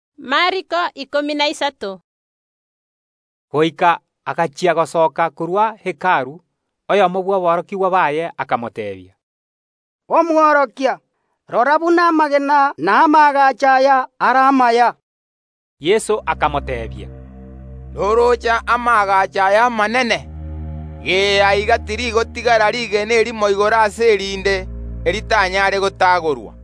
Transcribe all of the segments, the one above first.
Ekero Yeso are gosoka korwa Hekalu, oyomo bw’aborokigwa baye akamoteebia, “Omworokia, rora buna amagena na amaagacho aya are amaya!” Yeso akamoteebia, “Norooche amaagacho aya amanene? Aiga tirigotigara rigena erimo igoro ase erinde, eritanyaare gotaagorwa.”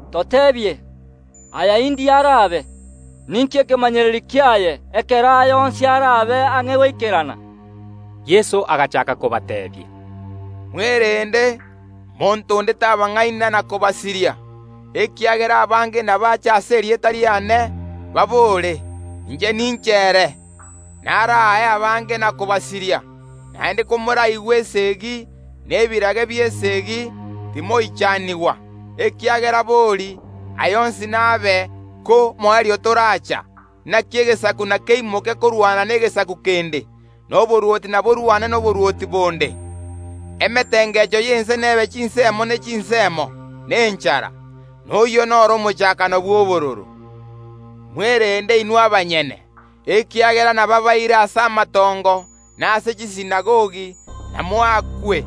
“Toteebie, aya indiriri arabe? Ninki ekemanyererio kiaye ekero aya onsi arabe ang’e goikerana?” Yeso agachaaka kobateebia, “Mwerende, monto onde tabang’aina, ekiagera abange inabache ase erieta riane, babore: Inche ninche ere; inabasirie abange. Naende komoraigwe esegi, na ebirage bi’esegi, timoichanigwa, ekiagera bori, aya onsi nabe, ko moerio toracha. Inaki egesaku nkeimoke korwana negesaku kende, na oborwoti mborwane noborwoti bonde. Emetengecho y’ense n’ebe chinsemo ne chinsemo, na enchara. Amang’ana ayio nigo arabe buna obororo bw’eritang’ani bw’okoibora. “Mwerende inwe abanyene, ekiagera nababaire ase ebigambero, na ase chisinagogi, moakwe.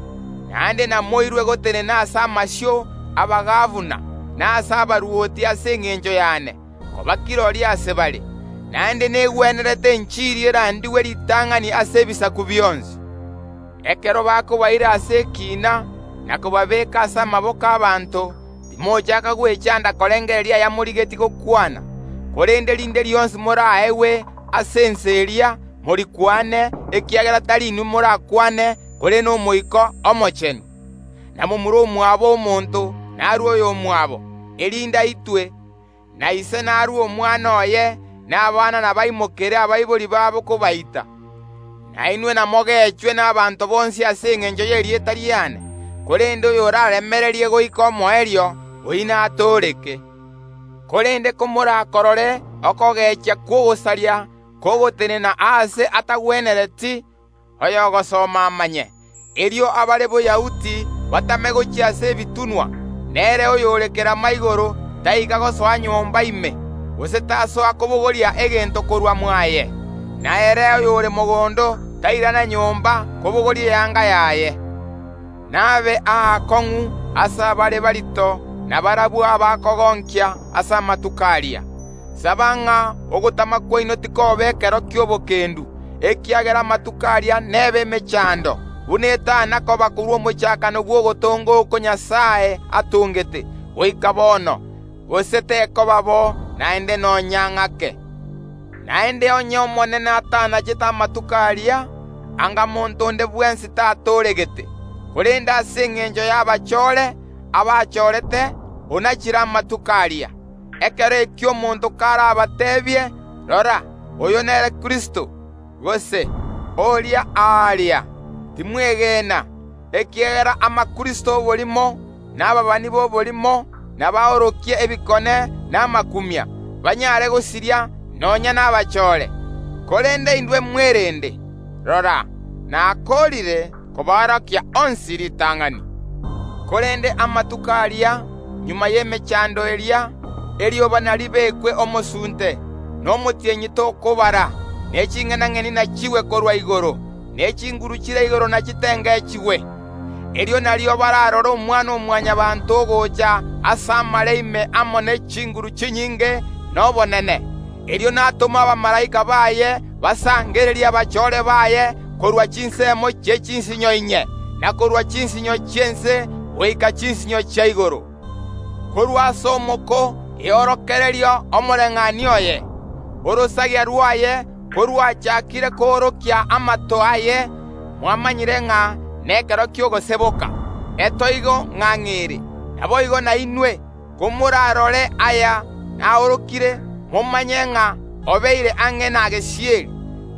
Naende inamoirwe gotenena ase amasio y’abagabana na ase abarwoti ase engencho y’ane, koba kirori ase bare. Naende negwenerete enchiri erandigwe ritang’ani ase ebisaku bionsi. Ekero bakobaira ase ekiina, na kobabeeka ase amaboko y’ abanto, timochaaka gwechanda korengereria ayamorigetie gokwana; korende rinde rionsi moraegwe ase ensa eria, morikwane, ekiagera tari inwe morakwane, korende n’Omoika Omochenu. Na momura omwabo omonto narue oyomwabo, erinde aitwe, na ise narue omwana oye; na abana nabaimokere abaibori babo kobaita. Nainwe namogechwe n’abanto bonsi ase engencho y’erieta riane, korende oyoraremererie goika omoerio, oyio natooreke. “Korende komorakorore okogechia kw’ogosaria kogotenena aase atagwenereti, (oyogosoma amanye), erio abare Boyahudi batame gochia ase ebitunwa; na ere oyore kerama igoro taika gosoa nyomba ime, gose tasoa kobogoria egento korwa mwaye; na ere oyore mogondo tairana nyomba kobogoria eanga yaye. N’abe aakong’u ase abare morito na barabwo abakogonkia ase amatuko aria. Saba ng’a ogotama kwaino tikoba ekero gi’etoigo, ekiagera amatuko aria n’ebe emechando, buna etana koba korwa omochakano bw’ogotonga oko Nyasae atongete, goika bono, gose tekoba bo naende nonya ng’ake. Naende onye Omonene atanachete amatuko aria, anga monto onde bwensi tatooregete, korende ase engencho y’abachore, abachorete, onachire amatuko aria. Ekero ekio omonto karabatebie: Rora, oyo nere Kristo, gose: Oria aaria, timwegena, ekiagera abakristo b’oborimo, na ababani b’oborimo nabaorokie ebikone na amakumia, banyare gosiria nonya nabachore ko eranyarekane. Korende inwe mwerende! Rora, nakoorire koborokia onsi ritang’ani. “Korende amatuko aria, magega y’emechando eria, erioba naribekwe omosunte, na omotienyi tokobara, ne ching’enang’eni nachigwe korwa igoro, ne chinguru chire igoro nachitengechigwe. Erio nario bararore Omwana-o-Mwanyabaanto ogocha ase amare ime amo ne chinguru chinyinge na obonene. Erio natome abamalaika baye basangererie abachore baye korwa chinsemo chie chinsinyo inye, na korwa chinsinyo chi’ense goika chinsinyo chia igoro. “Korwa ase omoko eorokererie omobayeeno oyo. Orosagia rwaye korwachaakire koorokia amato aye, mwamanyire ng’a nekero ki’ogoseboka, egura gura ng’ang’e ere. Naboigo nainwe, komorarore aya aorokire, momanye ng’a obeire ang’e na gesieri.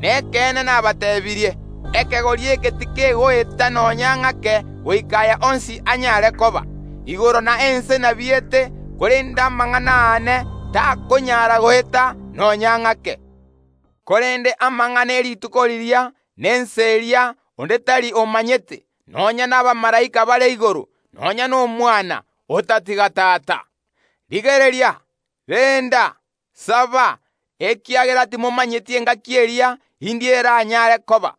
Nekeene nabateebirie: Ekegori eke tikegoeta nonya ng’ake goika aya onsi anyare koba. Igoro na ense nabiete, korende amang’ana aane takonyara goeta nonya ng’ake. “Korende amang’ana ye rituko riria na ensa eria onde tari omanyete, nonya nabamalaika bare igoro, nonya n’Omwana, otatiga Tata. Rigereria, renda, saba, ekiagera timomanyeti engaki eria indi eranyare koba.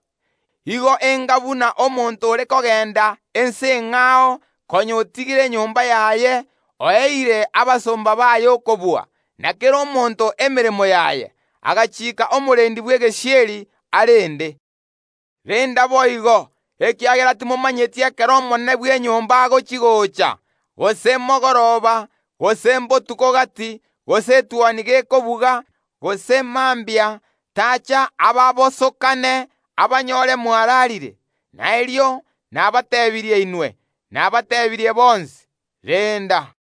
Igo enga buna omonto ore kogenda ense eng’ao konya otigire enyomba yaye, oeire abasomba baye okobua, na kera omonto emeremo yaye; agachiika omorendi bw’egesieri arende. Renda boigo, ekiagera timomanyeti ekero omonene bw’enyomba agochi‐gocha, gose mogoroba, gose mbotuko gati, gose etuoni gekobuga, gose mambia, tacha ababasokanie, abanyore mwararire. Na erio nabateebirie inwe, nabateebirie bonsi: Renda!”